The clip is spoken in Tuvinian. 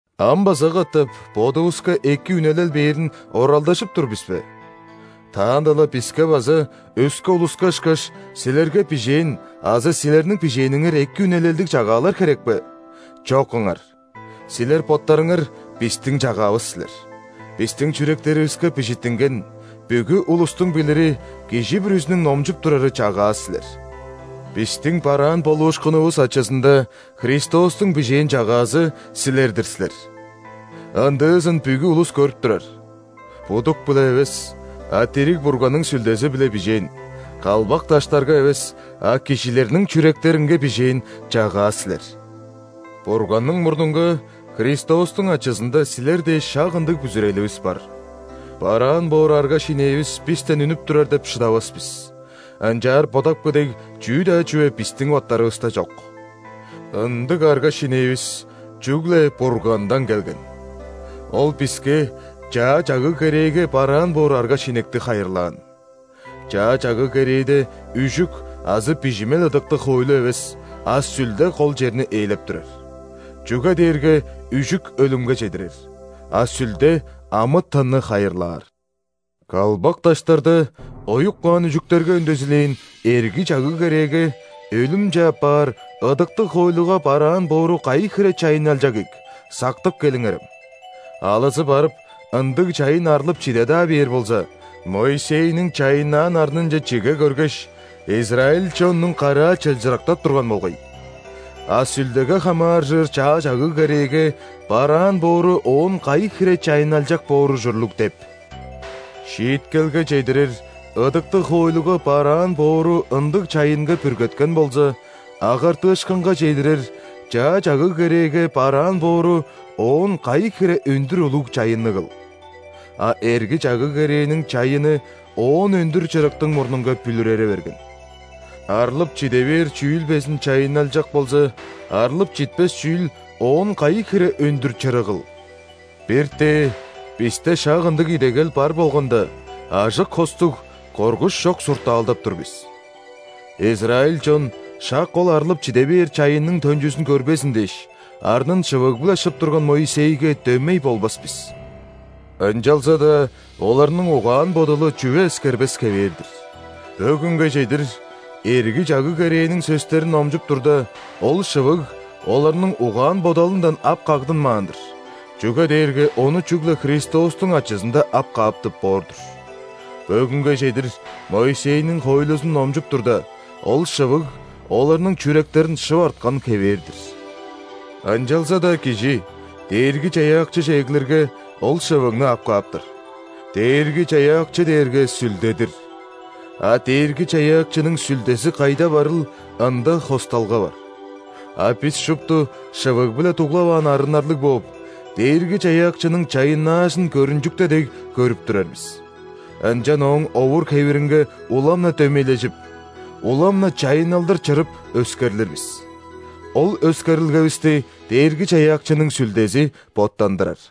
Ам база катап бодувуска эки үнелел бээрин оралдажып тур бис бе? Таанда-ла биске база, өске улуска ышкаш, силерге бижээн азы силерниң бижээниңер эки үнелелдиг чагаалар херек бе? Чок ыңар! Силер боттарыңар – бистиң чагаавыс силер! Бистиң чүректеривиске бижиттинген, бүгү улустуң билири, кижи бүрүзүнүң номчуп турары чагаа силер. Бистиң бараан болуушкунувус ачызында Христостуң бижээн чагаазы – силер-дир силер. Ындыызын бүгү улус көрүп турар. Будук-биле эвес, а дириг Бурганның Сүлдези-биле бижээн; калбак даштарга эвес, а кижилерниң чүректеринге бижээн чагаа силер. Бурганның мурнунга Христостуң ачызында силер дээш шак ындыг бүзүреливис бар. Бараан боор арга-шинээвис бистен үнүп турар деп шыдавас бис, ынчаар бодапкы дег чүү-даа чүве бистиң боттарывыста чок. Ындыг арга-шинээвис чүгле Бургандан келген. Ол биске Чаа Чагыг-керээге бараан боор арга-шинекти хайырлаан. Чаа Чагыг-керээде үжүк азы бижимел ыдыктыг хоойлу эвес, а Сүлде кол черни ээлеп турар. Чүге дээрге үжүк өлүмге чедирер, а Сүлде амы-тынны хайырлаар. Калбак даштарда оюп каан үжүктерге үндезилээн Эрги Чагыг-керээге – өлүмче аппаар ыдыктыг хоойлуга бараан боору кайы хире чайынналчак ийик, сактып келиңерем. Алызы барып, ындыг чайын арлып чиде-даа бээр болза, Моисейниң чайыннаан арнынче чиге көргеш, израиль чоннуң караа чылчырыктап турган болгай. А Сүлдеге хамааржыр Чаа Чагыг-керээге бараан боору оон кайы хире чайынналчак боор ужурлуг деп?! Шииткелге чедирер ыдыктыг хоойлуга бараан боору ындыг чайынга бүргеткен болза, агартыышкынга чедирер Чаа Чагыг-керээге бараан боору оон кайы хире өндүр улуг чайынныгыл! А Эрги Чагыг-керээниң чайыны оон өндүр чырыктың мурнунга бүлүрере берген. Арлып чиде бээр чүүл безин чайынналчак болза, арлып читпес чүүл оон кайы хире өндүр чырыгыл! Бир-тээ бисте шак ындыг идегел бар болганда, ажык-хостуг, коргуш чок суртаалдап тур бис. Израиль чон шак ол арлып чиде бээр чайынның төнчүзүн көрбезин дээш, арнын шывыг-биле шып турган Моисейге дөмей болбас бис. Ынчалза-даа оларның угаан-бодалы чүве эскербес хевээр-дир. Бөгүнге чедир, Эрги Чагыг-керээниң сөстерин номчуп турда, ол шывыг оларның угаан-бодалындан ап кагдынмаан-дыр, чүге дээрге ону чүгле Христостуң ачызында ап кааптып боор-дур. Бөгүнге чедир, Моисейниң хоойлузун номчуп турда, ол шывыг оларның чүректерин шып арткан хевээр-дир. Ынчалза-даа кижи Дээрги-Чаяакчыже эглирге, ол шывыгны ап кааптар. Дээрги-Чаяакчы дээрге Сүлде-дир, а Дээрги-Чаяакчының Сүлдези кайда барыл, ында хосталга бар. А бис шупту, шывыг-биле дуглаваан арыннарлыг бооп, Дээрги-Чаяакчының чайыннаажын, көрүнчүкте дег, көрүп турар бис. Ынчан Ооң овур-хевиринге улам-на дөмейлежип, улам-на чайынналдыр чырып, өскерлир бис. Ол өскерилгевисти Дээрги-Чаяакчының Сүлдези боттандырар.